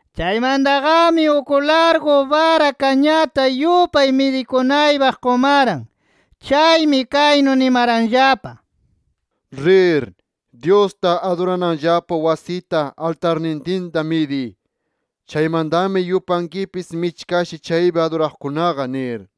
Chaymantaqami uk largu bara kañata yupay midikunaypaq qumaran. Chaymi kaynu nimaranllapa: “Rir, Dyusta adurananllapa wasita, altarnintinta, midiy. Chaymantami, yupankipis michkashi chaypi aduraqkunaqa nir.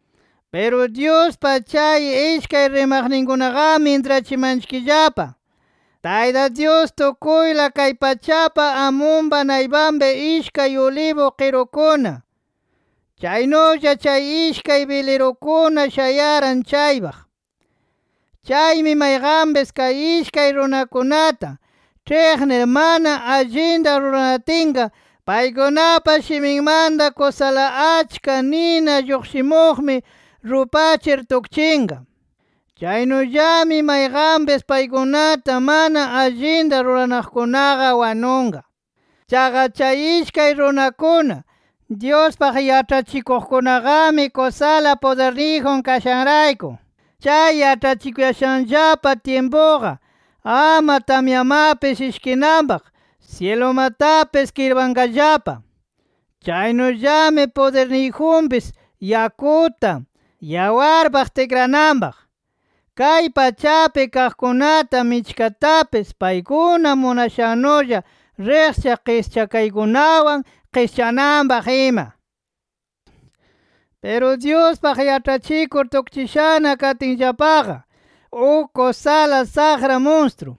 Piru Dyuspa chay ishkay rimaqninkunaqami intrachimanchikllapa Tayta Dyus tukuyla kay pachapa amunpa naypanpi ishkay ulibu qirukuna chaynulla chay ishkay bilirukuna shayaran chaypaq. Chaymi mayqanpis kay ishkay runakunata ĉhiqnir mana allinta ruranatinqa paykunapa shiminmanta kusala achka nina lluqshimuqmi rupachir tukchinqa. Chaynullami mayqanpis paykunata mana allinta ruranaqkunaqa wanunqa. Chaqa chay ishkay runakuna, Dyuspaq yaĉhachikuqkunaqami, kusala pudirniyjun kashanrayku, chay yaĉhachikuyashanllapa tyimpuqa ama tamyamapis ishkinanpaq syilumatapis kirpanqallapa. Chaynullami pudirniyjunpis, yakuta yawarpaq tikrananpaq, kay pachapi kaqkunata michkatapis paykuna munashannulla riqchaq qischakaykunawan qischananpaq ima. Piru Dyuspaq yaĉhachikur tukchishana katinllapaqa, uk kusala saqra munstru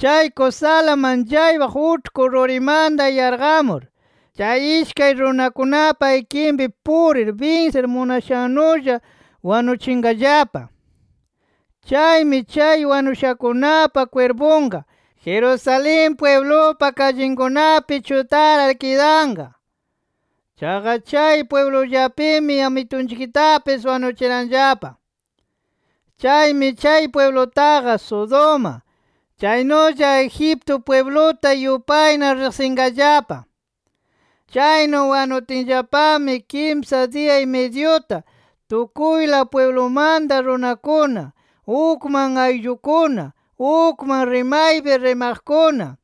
chay kusala manchaypaq uĉhku rurimanta yarqamur, chay ishkay runakunapa ikinpi purir binsir munashannulla wanuchinqallapa. Chaymi chay wanushakunapa kwirpunqa, Jerusalén pwiblupa kallikunapi chutarar kidanqa. Chaqa chay pwiblullapimi Amitunchiktapis wanuchiranllapa. Chaymi chay pwiblutaqa Sodoma, chaynulla Egipto pwibluta yupayna riqsinqallapa. Chaynu wanutinllapami kimsa diya-y-midyuta, tukuyla pwiblumanta runakuna, ukman ayllukuna, ukman rimaypi rimaqkuna,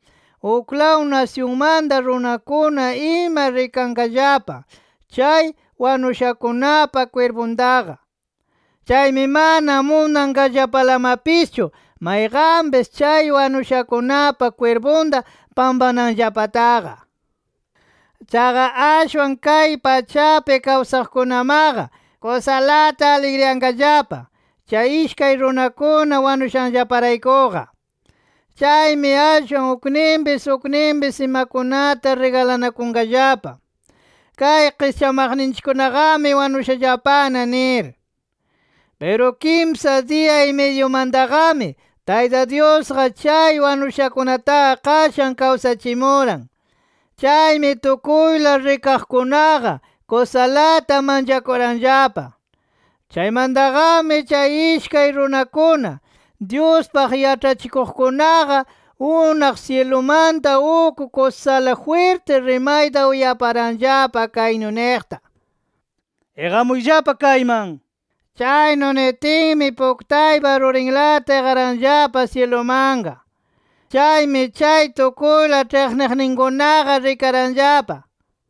uklaw nasyunmanta runakuna ima rikanqallapa chay wanushakunapa kwirpuntaqa. Chaymi mana munanqallapalamapischu mayqanpis chay wanushakunapa kwirpunta pampananllapataqa. Chaqa ashwan kay pachapi kawsaqkunamaqa kusalata aligriyanqallapa chay ishkay runakuna wanushanllaparaykuqa. Chaymi ashwan ukninpis ukninpis imakunata rigalanakunqallapa kay qischamaqninchikkunaqami wanushallapana nir. Piru kimsa diya-y-midyumantaqami, Tayta Dyusqa chay wanushakunataqa qashan kawsachimuran. Chaymi tukuyla rikaqkunaqa kusalata manchakuranllapa. Chaymantaqami chay ishkay runakuna, Dyuspaq yaĉhachikuqkunaqa, unaq syilumanta uk kusala jwirti rimayta uyaparanllapa, kaynu niqta: “¡Iqamuyllapa kayman!” nir. Chaynu nitinmi, puktaypa rurinlata iqaranllapa syilumanqa. Chaymi chay tukuyla ĉhiqniqninkunaqa rikaranllapa.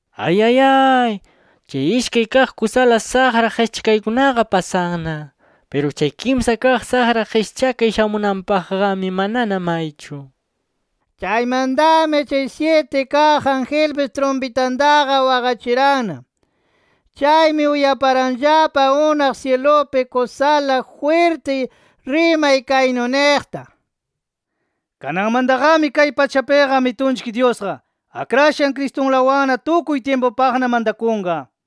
Ayayay, chay ishkay kaq kusala saqra qischakaykunaqa pasanna. Piru chay kimsa kaq saqra qischakay shamunanpaqqami, manana maychu. Chaymantami chay syiti kaq angelpis trumpitantaqa waqachiranna. Chaymi uyaparanllapa unaq syilupi kusala jwirti rimay kaynu niqta: “Kananmantaqami kay pachapiqa Amitunchik Dyusqa, Akrashan Cristunlawanna tukuy tyimpupaqna mantakunqa” nir.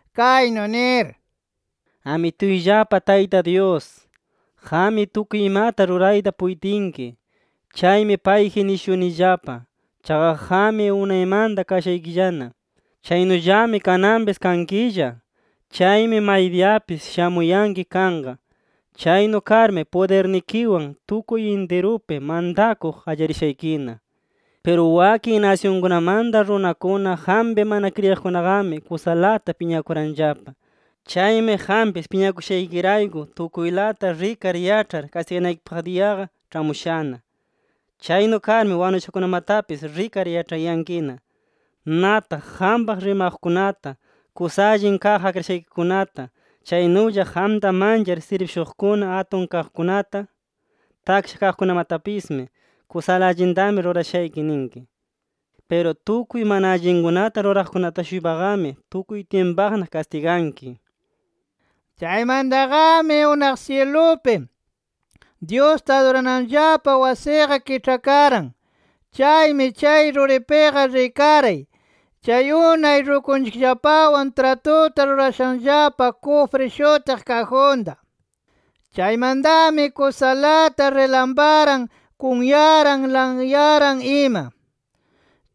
kaynu nir: “Amituyllapa Tayta Dyus, qammi tukuy imata rurayta puytinki. Chaymi payji nishunillapa. Chaqa qammi unaymanta kashaykillana. Chaynullami kananpis kankilla. [Chaymi maydiyapis shamuyanki kanqa]. Chaynu karmi pudirnikiwan tukuy intirupi mantakuq qallarishaykina. Piru wakin nasyunkunamanta runakuna qampi mana kriyiqkunaqami kusalata piñakuranllapa. Chaymi qampis piñakushaykirayku tukuylata rikar yaĉhar kastiganaykipaq diyaqa ĉhamushana. Chaynu karmi wanushakunamatapis rikar yaĉhayankina. Nataq qampaq rimaqkunata, kusa allin kaq akrashaykikunata, chaynulla qamta manchar sirbishuqkuna atun kaqkunata, taksha kaqkunamatapismi kusala allintami rurashayki ninki. Piru tukuy mana allinkunata ruraqkunata-shuypaqami tukuy tyimpupaqna kastiganki” nir. Chaymantaqami unaq syilupi, Dyusta adurananllapa wasiqa kiĉhakaran. Chaymi chay ruripiqa rikaray, chay unay rukunchikllapawan tratuta rurashanllapa kufri shutiq kajunta. Chaymantami kusalata rilamparan, kunyaran, lanyaran ima.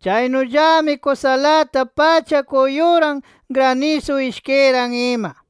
Chaynullami kusalata pacha kuyuran, granisu ishkiran ima.